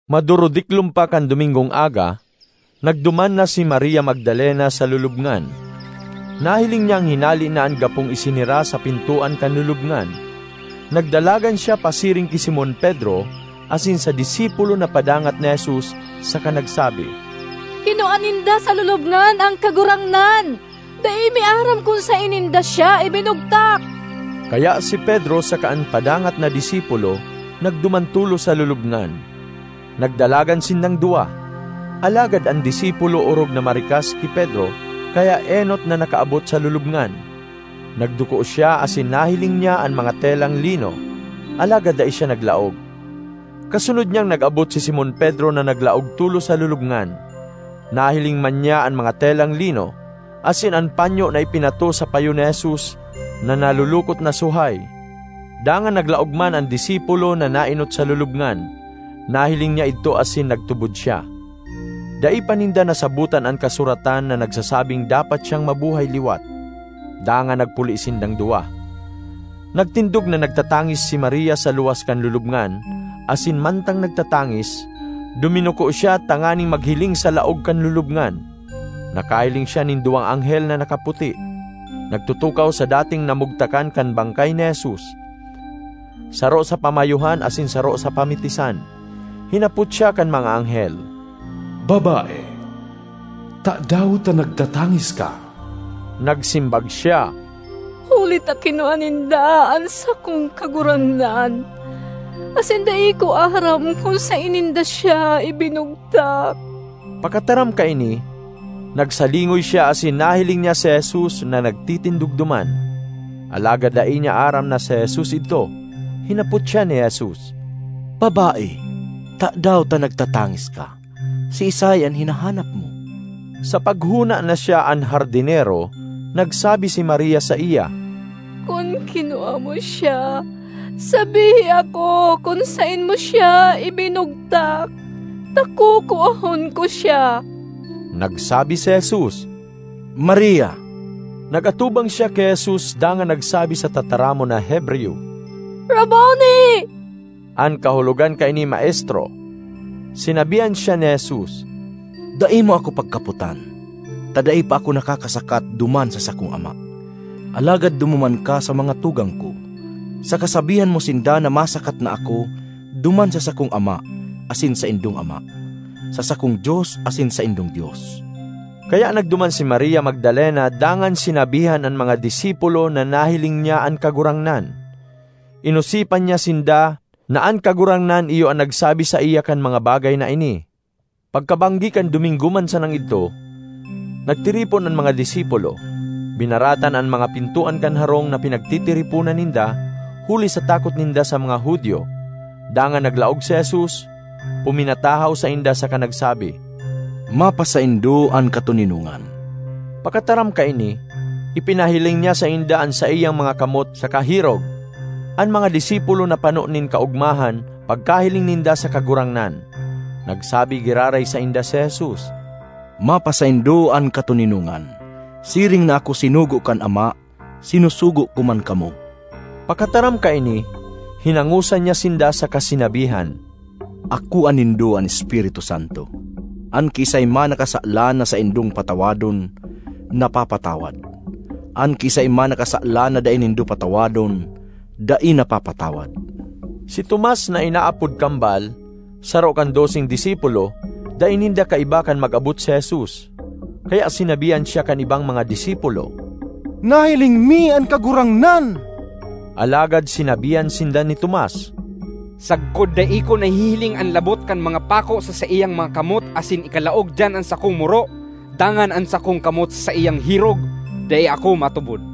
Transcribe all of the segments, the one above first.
Madurudiklom pa kan Domingong aga, nagduman na si Maria Magdalena sa lulubngan. Nahiling niyang hinale na an gapong isenera sa pintoan kan lulubngan. Nagdalagan siya pasiring ki Simon Pedro asin sa disipulo na padangat ni Jesus saka nagsabi, “Kinua ninda sa lulubngan an Kagurangnan; dai mi aram kun saen ninda siya ibinugtak!” Kaya si Pedro saka an padangat na disipulo nagduman tolos sa lulubngan. Nagdalagan sindang duwa, alagad an disipulo orog na marikas ki Pedro kaya enot na nakaabot sa lulubngan. Nagduko siya asin nahiling niya an mga telang lino, alagad dai siya naglaog. Kasunod niyang nag-abot si Simon Pedro na naglaog tolos sa lulubngan. Nahiling man niya an mga telang lino, asin an panyo na ipinatos sa payo ni Jesus na nalulukot na suhay. Dangan naglaog man an disipulo na naenot sa lulubngan; nahiling niya idto asin nagtubod siya. (Dai pa ninda nasabotan an kasuratan na nagsasabing dapat siyang mabuhay liwat.) Dangan nagpuli sindang duwa. Nagtindog na nagtatangis si Maria sa luwas kan lulubngan, asin mantang nagtatangis, duminuko siya tanganing maghiling sa laog kan lulubngan. Nakahiling siya nin duwang anghel na nakaputi, nagtutukaw sa dating namugtakan kan bangkay ni Jesus: saro sa pamayohan asin saro sa pamitisan. Hinapot siya kan mga anghel, “Babae, tadaw ta nagtatangis ka?” Nagsimbag siya, “Huli ta kinua ninda an sakong Kagurangnan asin dai ko aram kun saen ninda siya ibinugtak!” Pakataram kaini, nagsalingoy siya asin nahiling niya si Jesus na nagtitindog duman; alagad dai niya aram na si Jesus idto. Hinapot siya ni Jesus, “Babae, tadaw ta nagtatangis ka? Siisay an hinahanap mo?” Sa paghona na siya an hardinero, nagsabi si Maria saiya, “Kun kinua mo siya, sabihi ako kun saen mo siya ibinugtak ta kukuahon ko siya.” Nagsabi si Jesus, “Maria!” Nag-atubang siya ki Jesus dangan nagsabi sa tataramon na Hebreyo, “Rabboni!” (An kahulogan kaini, “Maestro.”) Sinabihan siya ni Jesus, “Dai mo ako pagkapotan ta dai pa ako nakakasakat duman sa sakong Ama. Alagad dumuman ka sa mga tugang ko saka sabihan mo sinda na masakat na ako duman sa sakong Ama asin saindong Ama, sa sakong Dios asin saindong Dios.” Kaya nagduman si Maria Magdalena dangan sinabihan an mga disipulo na nahiling niya an Kagurangnan. Inosipan niya sinda na an Kagurangnan iyo an nagsabi saiya kan mga bagay na ini. Pagkabanggi kan Domingo man sanang idto, nagtiripon an mga disipulo. Binaratan an mga pintoan kan harong na pinagtitiriponan ninda huli sa takot ninda sa mga Judio. Dangan naglaog si Jesus, puminatahaw sainda saka nagsabi, “Mapasaindo an katoninongan.” Pakataram kaini, ipinahiling niya sainda an saiyang mga kamot saka hirog. An mga disipulo napano nin kaogmahan pagkahiling ninda sa Kagurangnan. Nagsabi giraray sainda si Jesus, “Mapasaindo an katoninongan. Siring na ako sinugo kan Ama, sinusugo ko man kamo.” Pakataram kaini, hinangosan niya sinda saka sinabihan, “Akoa nindo an Espiritu Santo. An kiisay man na kasalan na saindong patawadon, napapatawad; an kiisay man na kasalan na dai nindo patawadon, dai napapatawad.” Si Tomas (na inaapod Kambal), saro kan doseng disipulo, dai ninda kaiba kan mag-abot si Jesus. Kaya sinabihan siya kan ibang mga disipulo, “Nahiling mi an Kagurangnan!” Alagad sinabihan sinda ni Tomas, “Sagkod dai ko nahihiling an labot kan mga pako sa saiyang mga kamot asin ikalaog diyan an sakong muro, dangan an sakong kamot sa saiyang hirog, dai ako matubod.”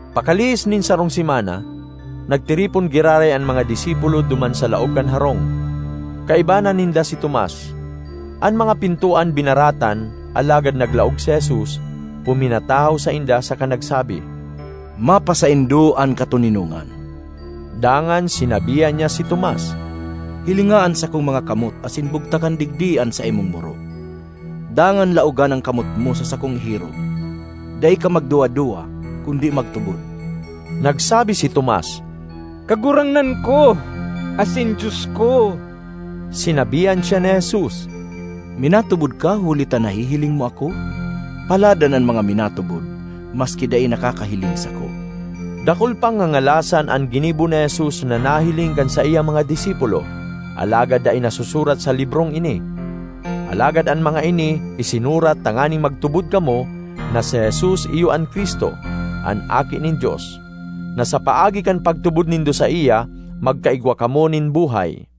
Pakalihis nin sarong semana, nagtiripon giraray an mga disipulo duman sa laog kan harong; kaiba na ninda si Tomas. An mga pintoan binaratan, alagad naglaog si Jesus, puminatahaw sainda saka nagsabi, “Mapasaindo an katoninongan.” Dangan sinabihan niya si Tomas, “Hilinga an sakong mga kamot asin bugtakan digdi an saimong muro; dangan laogan an kamot mo sa sakong hirog. Dai ka magduwa-duwa kundi magtubod!” Nagsabi si Tomas, “Kagurangnan ko asin Dios ko!” Sinabihan siya ni Jesus, “Minatubod ka huli ta nahihiling mo ako? Paladan an mga minatubod maski dai nakakahiling sako!” Dakul pang ngangalasan an ginibo ni Jesus na nahiling kan saiyang mga disipulo alagad dai nasusurat sa librong ini. Alagad an mga ini isinurat tanganing magtubod kamo na si Jesus iyo an Cristo, an Aki nin Dios, na sa paagi kan pagtubod nindo saiya, magkaigwa kamo nin buhay.